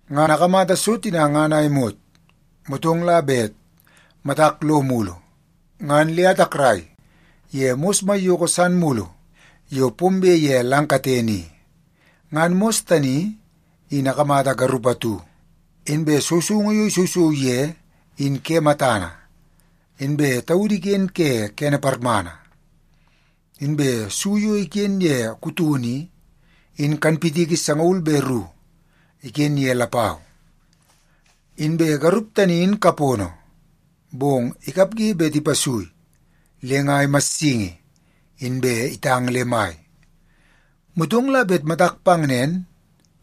Ngan akamata so tina ngan a imot, motong la bet matak lo mulu, ngan le atakrai ye mos maiyoko san mulu yo pombe ye lang katene i. Ngan mos tani in akamata garup atu, inbe sousoungu yo isousou ye in ke matana, inbe taudu iken ke kene parmana. Inbe su yo iken ye kutono i, in kanpitiki sangaul be ru iken ye lapau. Inbe garup tani in kapono, bong ikapge bet ipasui le nga imassingi, inbe itang le mai. Motong la bet matak pang nen,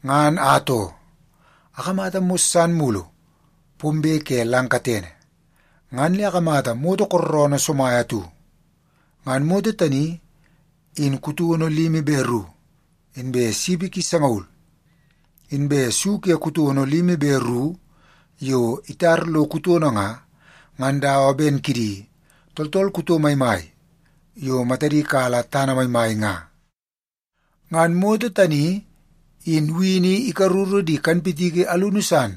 ngan atoo, akamata mos san mulu pombe ke lang katene, ngan le akamata moto kooroonoo somai atu. Ngan moto tani in kutono limi be ru, inbe sipi ki sangaul. Inbe su ke kutono limi be ru yo itar lo kutono nga, ngan dawa ben kidi tooltool kuto maimai yo matadi kala tana maimai nga. Ngan moto tani in wini ikaruru di kanpitiki alunu san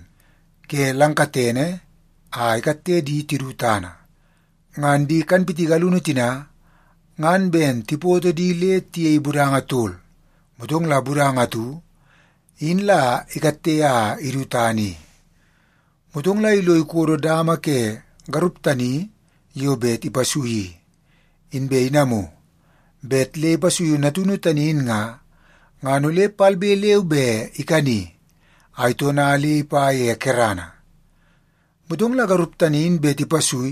ke lang katene a ikatte di tidu tana. Ngan di kanpitiki alunu tina ngan ben tipoto di le tiyei budanga tol, motong la budanga atu in la ikatte a idu tana i. Motong la ilo ikodo dama ke garup tani yo bet ipasui i, inbe inamu bet le ipasuiu natunu tani in nga, ngan ole palbe leu be ikani a itona le ipa ye kerana. Motong la garup tani in bet ipasui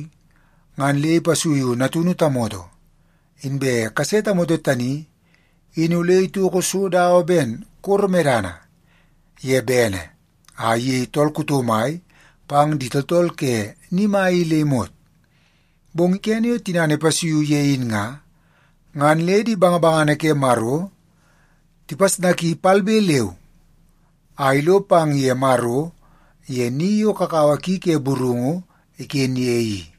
ngan le ipasuiu natunu tamoto. Inbe kase tamoto tani in ole itoko so dawa ben koro medana ye bene a iyei tool kuto mai pang di tooltool ke ni mai i le imot. Bong kene yo tinana ipasuiu ye in nga, ngan le di bangabangana ke Maro tipasnaki palbe leu a ilo pang ye Maro ye ni yo kakawa ki ke burungu iken ye i.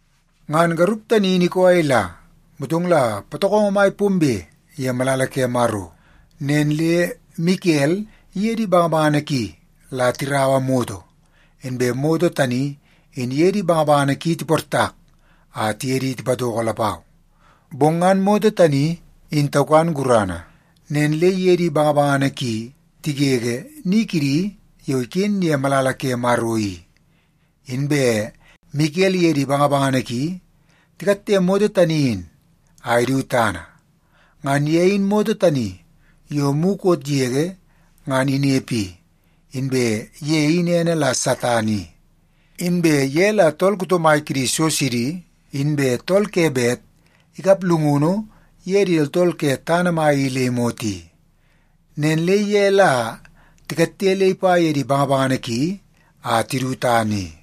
Ngan garup tani in ikoo a ila, motong la patokongo mai pombe ye malala ke Maro. Nen le Mikel iye di bangabangana ki la tiraua moto, inbe moto tani in iye di bangabangana ki tiportak a tiye di tipatoko lapau. Bong ngan moto tani in taukan gurana, nen le iye di bangabangana ki tigege ni kidi yo iken ye malala ke Maro i, inbe Mikel iye di bangabangana ki tikatte moto tani in a idu tana. Ngan ye in moto tani yo mukot yege ngan inepe i, inbe ye in ene la Satan i. Inbe ye la tool kuto mai kidi so sidi, inbe tool ke bet ikap llungunu ye di tooltool ke tana mai i le imot i. Nen le ye la tikatte le ipa ye di bangabangana ki a tidu tana i.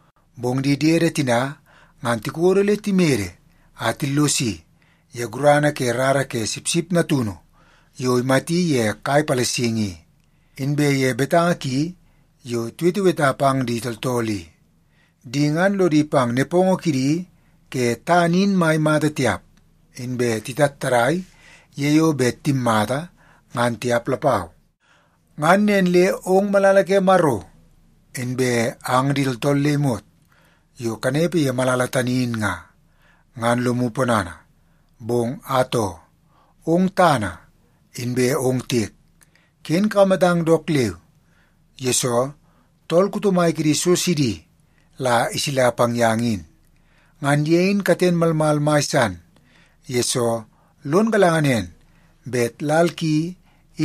Bong di diede tina ngan tikodo le timede a tillosi ye gurana ke rara ke Sipsip Natunu yo imati ye kai palasingi i, inbe ye betanga ki yo tiweteweta pang di tooltool i. Di ngan lodi pang nepongo kidi ke tana in mai mata tiap, inbe titattadai ye yo bet timmata, ngan tiap lapau. Ngan nen le ong malala ke Maro, inbe ang di tooltool le imot yo kanepe ye malala tani in nga, ngan lomu ponana. Bong atoo, ong tana inbe ong tiek, ken kakamatang dook leu, yesoo tool kuto mai kidi so sidi la isila pang yang in. Ngan ye in katen malmal mai san, yesoo lon galanga nen bet lal ki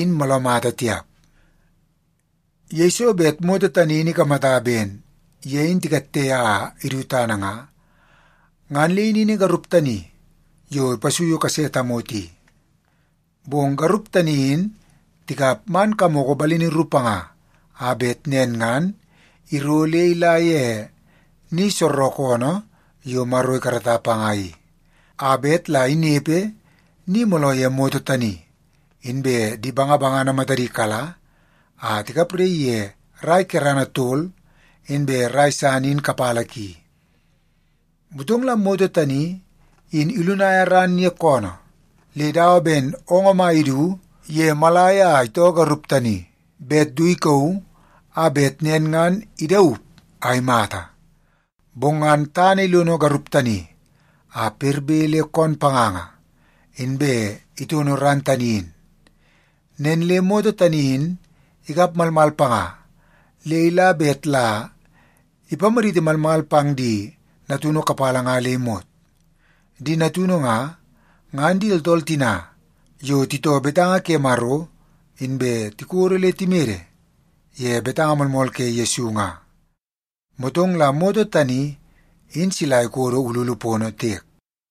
in mooloo mata tiap.” Yeiso bet moto tani in ikamata ben ye in tikatte a idu tana nga, ngan le inini garup tani yo ipasuiu kase tamoto i. Bong garup tani in tikap man kamoko balini ru panga a bet nen ngan iro le ila ye ni soorookoonoo yo Maro ikarata panga i, a bet la inepe ni mooloo ye moto tani, inbe di bangabangana matadi kala a tikapraii ye rai kerana tol inbe rai san in kapala ki. Motong la moto tani in ilunaia ran ye koonoo le dawa ben oongoo mai idu ye moolai a itoo garup tani bet du ikauu a bet nen ngan idaup a imata. Bong ngan tana ilono garup tani a perbe le koon panganga, inbe itono ran tani in. Nen le moto tani in ikap malmal panga le ila bet la ipamaditi malmal pang di natunu kapala nga le imot. Di natunu nga, ngan di tooltool tina yo titoo betanga ke Maro inbe tikodo le timede ye betanga moolmool ke Yesu nga. Motong la moto tani in sila ikodo ululu pono tiek.